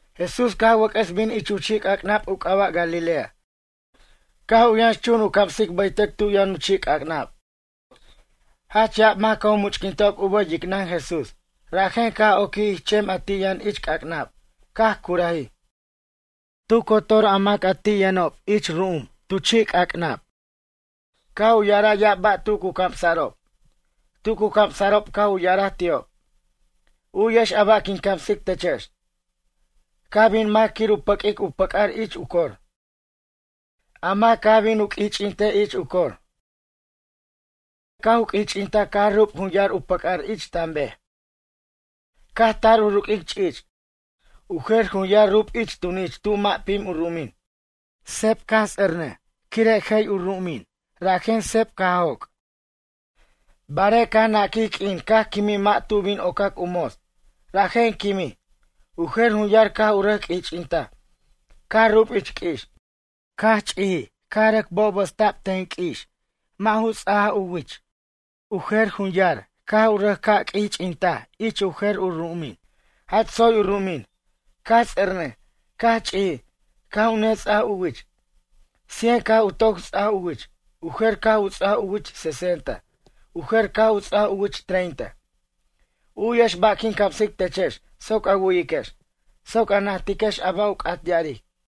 Jesús caj wʌc'ʌs bin ich u chi'c'acnab u c'aba' Galilea caj u yʌnx chun u camsic bʌytʌc tu yʌn u chi'c'ac'nab. Jach ya'ab mac caj u much'quintob u bʌj yicnʌn Jesús rajen caj oquij ich chem a ti' yʌn ich c'ac'nab caj curajij. Tu cotor a mac ti' yʌnob ich ru'um tu chi' c'ac'nab. Caj u ya'araj ya'ab ba' tu cu camsa'rob. Tu cu camsa'rob caj u ya'araj ti'ob: ―U'yex a ba' quin camsic techex. Caj bin mac quir u pʌq'uic u pʌc'ar ich u cor. A mac caj bin u q'uich'intej ich u cor. Carique' caj u q'uich'intaj caj rub jun yar u pʌc'ar ich tam bej. Caj tar u ruq'uic ch'ich'. U jer jun yar rub ich tunich tu mʌ' pim u ru'umin. Seb caj ts'ernʌj quire' jay u ru'umin, rajen seb caj joc'. Barej caj naquij q'uin caj quimij mʌ' tu bin ocac u mots, rajen quimij. U jer jun yar caj u rʌc q'uich'intaj, caj rub ich q'ui'ix. Caj ch'ijij caj rʌc bobosta'b ten q'ui'ix mʌ' ju ts'ajaj u wich. U jer jun yar caj u rʌc ca' q'uich'intaj ich u jer u ru'umin. Jach tsoy u ru'umin. Caj ts'ernʌj, caj ch'ijij, caj u nets'aj u wich. Cien caj u toc ts'aj u wich. U jer caj u ts'aj u wich sesenta. U jer caj u ts'aj u wich treinta. U'yex ba' quin camsic techex soc a wu'yiquex, soc a najtiquex a ba' u c'at ya'aric.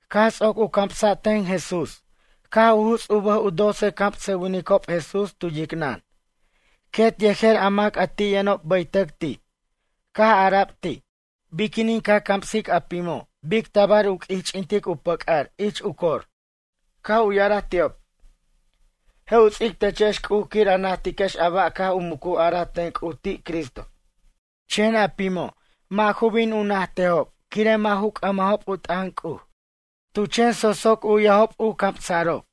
Caj ts'oc u camsa' ten Jesús caj u juts' u bʌj u doce camsʌwinicob Jesús tu yicnʌn, quet yejer a mac a ti' yʌnob bʌytʌc ti'. Caj ara'b ti': ―Biquinin ca camsic a pimo' bic tabar u q'uich'intic u pʌc'ar ich u cor? Caj u ya'araj ti'ob: ―Je' u ts'ic techex C'uj quir a najtiquex a ba' caj u mucu araj ten C'uj ti' Cristo. Chen a pimo' mʌ' ju bin u najtejob quire' mʌ' ju c'ʌmajob u t'ʌn C'uj. Tu chen so'soc u'yajob camsa'rob.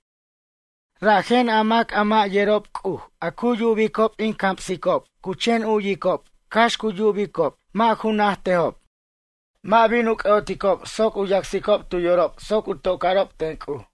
Rajen, a mac a mʌ' yerob C'uj a cu yubicob in camsicob cu chen u'yicob cax cu yubicob mʌ' ju najtejob. Mʌ' bin u c'ʌ'oticob soc u yacsicob tu yorob soc u toca'rob ten C'uj.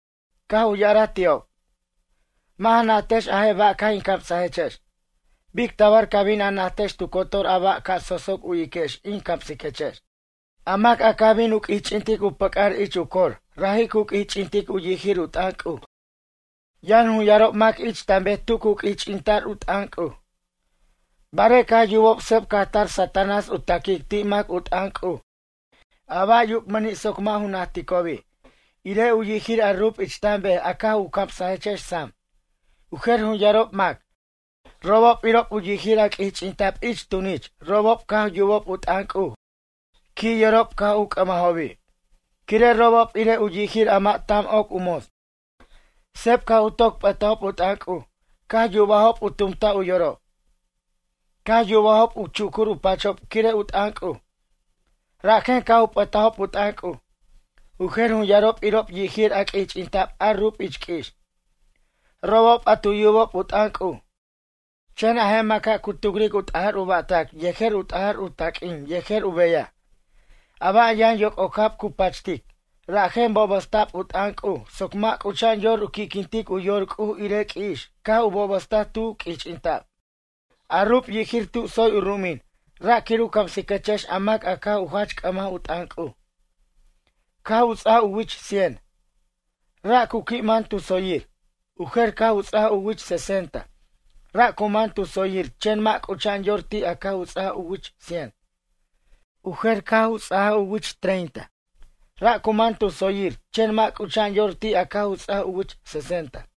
Caj u ya'araj ti'ob: ―Mʌ' ja najtajex a je' ba' caj in camsajechex. Bic tabar ca bin a najtex tu cotor a ba' ca so'soc u'yiquex in camsiquechex? A mac a caj bin u q'uich'intic u pʌc'ar ich u cor raji' cu q'uich'intic u yijir u t'ʌn C'uj. Yʌn jun yarob mac ich tan bej tu cu q'uich'ita'r u t'ʌn C'uj, barej caj u yubob seb caj tar Satanás u taquic ti' mac u t'ʌn C'uj a ba' yubmʌni' soc mʌ' ju najticobi', irej u yijir a rub ich tan bej a caj in camsajechex sam. U jer jun yarob mac, robob irob u yijir a q'uich'inta'b ich u tunich robob caj yubob u t'ʌn C'uj qui' yorob caj u c'ʌmajobi'. Quire' robob irej u yijir a mʌ' tam oc u mots. Seb caj u toc p'ʌtajob u t'ʌn C'uj caj yubajob u tumtaj u yorob. Caj yubajob u chucur u pachob quire' u t'ʌn C'uj, rajen caj u p'ʌtajob u t'ʌn C'uj. U jer jun yarob irob u yijir a q'uich'inta'b a rub ich q'ui'ix, robob a tu yubob u t'ʌn C'uj. Chen a je' maca' cu tucric u t'ajar u ba'tac yejer u t'ajar u taq'uin yejer u beyaj. A ba' yʌn yoc'ocab cu pachtic, rajen bobʌsta' u t'ʌn C'uj soc mʌ' c'ucha'an yor u qui'quintic u yor C'uj irej q'ui'ix caj u bobʌstaj tu q'uich'inta'b. A rub yijir tu tsoy u ru'umin ra' quir u camsiquechex a mac a caj u jach c'ʌmaj u t'ʌn C'uj, caj u ts'aj u wich cien, ra' cu qui' man tu tsoyir. U jer caj u ca' ts'ajaj u wich sesenta, ra' cu man tu tsoyir chen mʌ' c'ucha'an yor ti' a caj u ts'aj u wich cien. U jer caj u ts'ajaj u wich treinta, ra' cu man tu tsoyir chen mʌ' c'ucha'an yor ti' a caj u ts'ajaj u wich sesenta.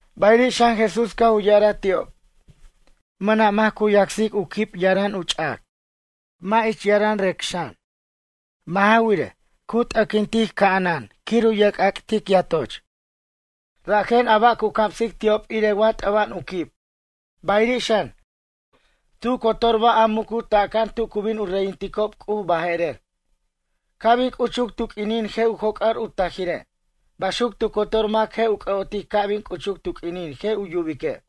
Bayiri' xan Jesús caj u ya'araj ti'ob: ―Mʌna' mac cu yacsic u quib yaram u ch'ac, mʌ' ich yaram rec xan. Mʌ' ja wirej, cu t'ʌquintic ca'anan quir u yerc'ac'tic yatoch. Rajen a ba' cu camsic ti'ob irej wa t'ʌba'an u quib. Bayiri' xan, tu cotor ba' a mucutaca'an tu cu bin u reyinticob C'uj baje'rer, ca' bin c'uchuc tu q'uinin je' u joc'ar u tajire'. Baxuc tu cotor mac je' u c'ʌ'otic ca' bin c'uchuc tu q'uinin je' u yubique'.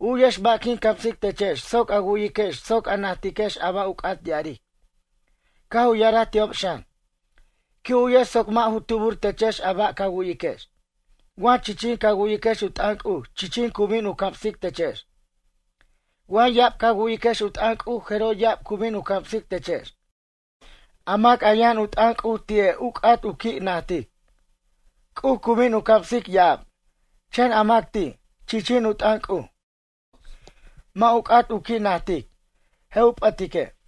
U'yex ba' quin camsic techex soc a wu'yiquex soc a najtiquex a ba' u c'at ya'aric. Caj u ya'araj ti'ob xan: ―Qui' u'yex soc mʌ' ju tubur techex a ba' ca wu'yiquex. Wa chichin ca wu'yiquex u t'ʌn C'uj chichin cu bin u camsic techex. Wa ya'ab ca wu'yiquex u t'ʌn C'uj jeroj ya'ab cu bin u camsic techex. A mac a yʌn u t'ʌn C'uj ti'e' u c'at u qui' najtic, C'uj cu bin u camsic ya'ab. Chen a mac ti', chichin u t'ʌn C'uj, mʌ' u c'at u qui' najtic, je' u p'ʌtique'.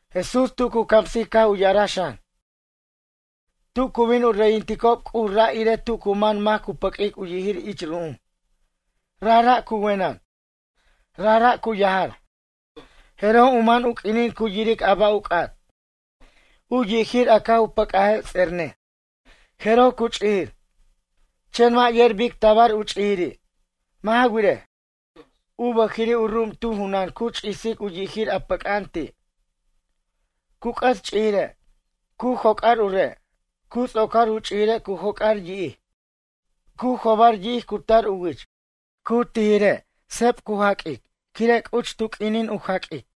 Jesús tu cu camsic caj u ya'araj xan: ―Tu cu bin u reyinticob C'uj ra' irej tu cu man mac cu pʌq'uic u yijir ich ru'um. Rajra' cu wenʌn, rajra' cu yajar, jeroj u man u q'uinin cu yiric a ba' u c'at. U yijir a caj u pʌc'aje' ts'ernʌj, jeroj cu ch'ijir. Chen mʌ' yer bic tabar u ch'ijiri'. Mʌ' ja wirej, u bʌjiri' u ru'um tu junan cu ch'isic u yijir a pʌc'a'an ti', cu c'ʌs ch'ijire', cu joc'ar u re'. Cu ts'ocar u ch'ijire' cu jobar yi'ij. Cu jobar yi'ij cu tar u wich. Cu tijire' seb cu jaq'uic quire' c'uchuc tu q'uinin u jaq'uic.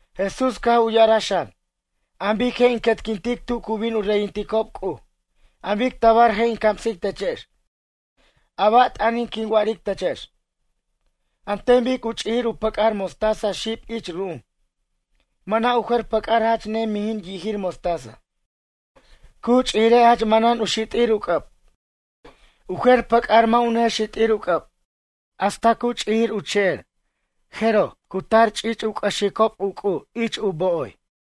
Jesús caj u ya'araj xan: ―An bic je' in quetquintic tu cu bin u reyinticob C'uj? An bic tabar je' in camsic techex? A ba' t'ʌnin quin wa'aric techex? An ten bic u ch'ijir u pʌc'ar mostaza xib ich ru'um. Mʌna' u jer pʌc'ar jach ne mijin yijir mostaza. Cu ch'ijire' jach manan u xit'ir u c'ʌb. U jer pʌc'ar mʌ' u ne xit'ir u c'ʌb. Hasta ch'ijir u che'er a jeroj, cu tar ch'ich' u c'ʌxicob u c'u' ich u bo'oy.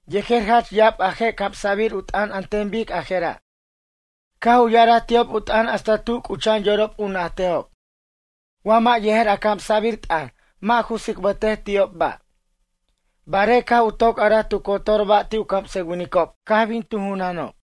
Yejer jach ya'ab a je' camsa'bir u t'ʌn an ten bic a jera' caj u ya'araj ti'ob u t'ʌn hasta tu c'ucha'an yorob u najtejob. Wa mʌ' yejer a camsa'bir t'ʌn mʌ' ju tsicbʌtej ti'ob ba', barej caj u toc araj tu cotor ba' ti' u camsʌwinicob caj bin tu junanob.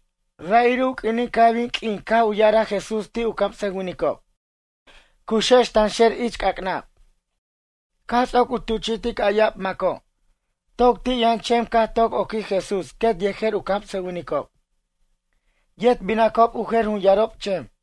Ra'iri' u q'uinin caj bin q'uin caj u ya'araj Jesús ti' u camsʌwinicob: ―Cuxex tanxer ich c'ac'nab. Caj ts'oc u tuchi'tic a ya'ab maco', toc ti' yʌn chem caj toc oquij Jesús quet yejer u camsʌwinicob. Yet binacob u jer jun yarob chem.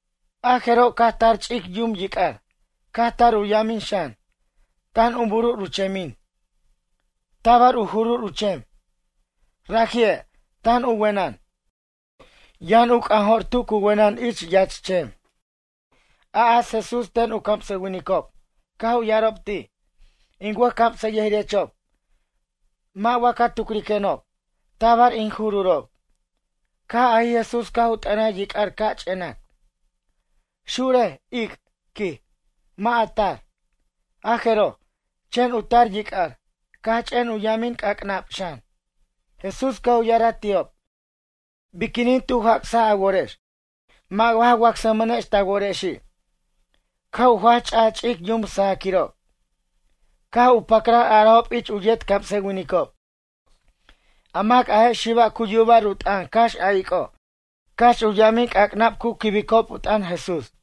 A jeroj caj tar ch'ic yum yic'ar, caj tar u yamin xan, tan u burur u chemin, tabar u jurur u chem. Raji'e', tan u wenʌn. Yʌn u c'anjo'r tu cu wenʌn ich yach chem. A'as Jesús ten u camsʌwinicob, caj u ya'arob ti': ―In wʌjcamsʌyʌjirechob, mʌ' wa ca tucriquenob? Tabar in jururob. Caj ajij Jesús caj u t'ʌnaj yic'ar ca' ch'enac: ―Xurej, ic' ―quij―. Mʌ' a tar. A jeroj, ch'en u tar yic'ar, caj ch'en u yamin c'ac'nab xan. Jesús caj u ya'araj ti'ob: ―Biquinin tu jac'saj a worex, mʌ' wa ja wacsmʌnex ta worexi'? Caj u jach ch'aj ch'ic yum sajaquirob, caj u pacran arajob ich u yet camsʌwinicob: ―A mac a je' xiba' cu yuba'r u t'ʌn cax a ic'o' cax u yamin c'acnab cu quibicob u t'ʌn Jesús?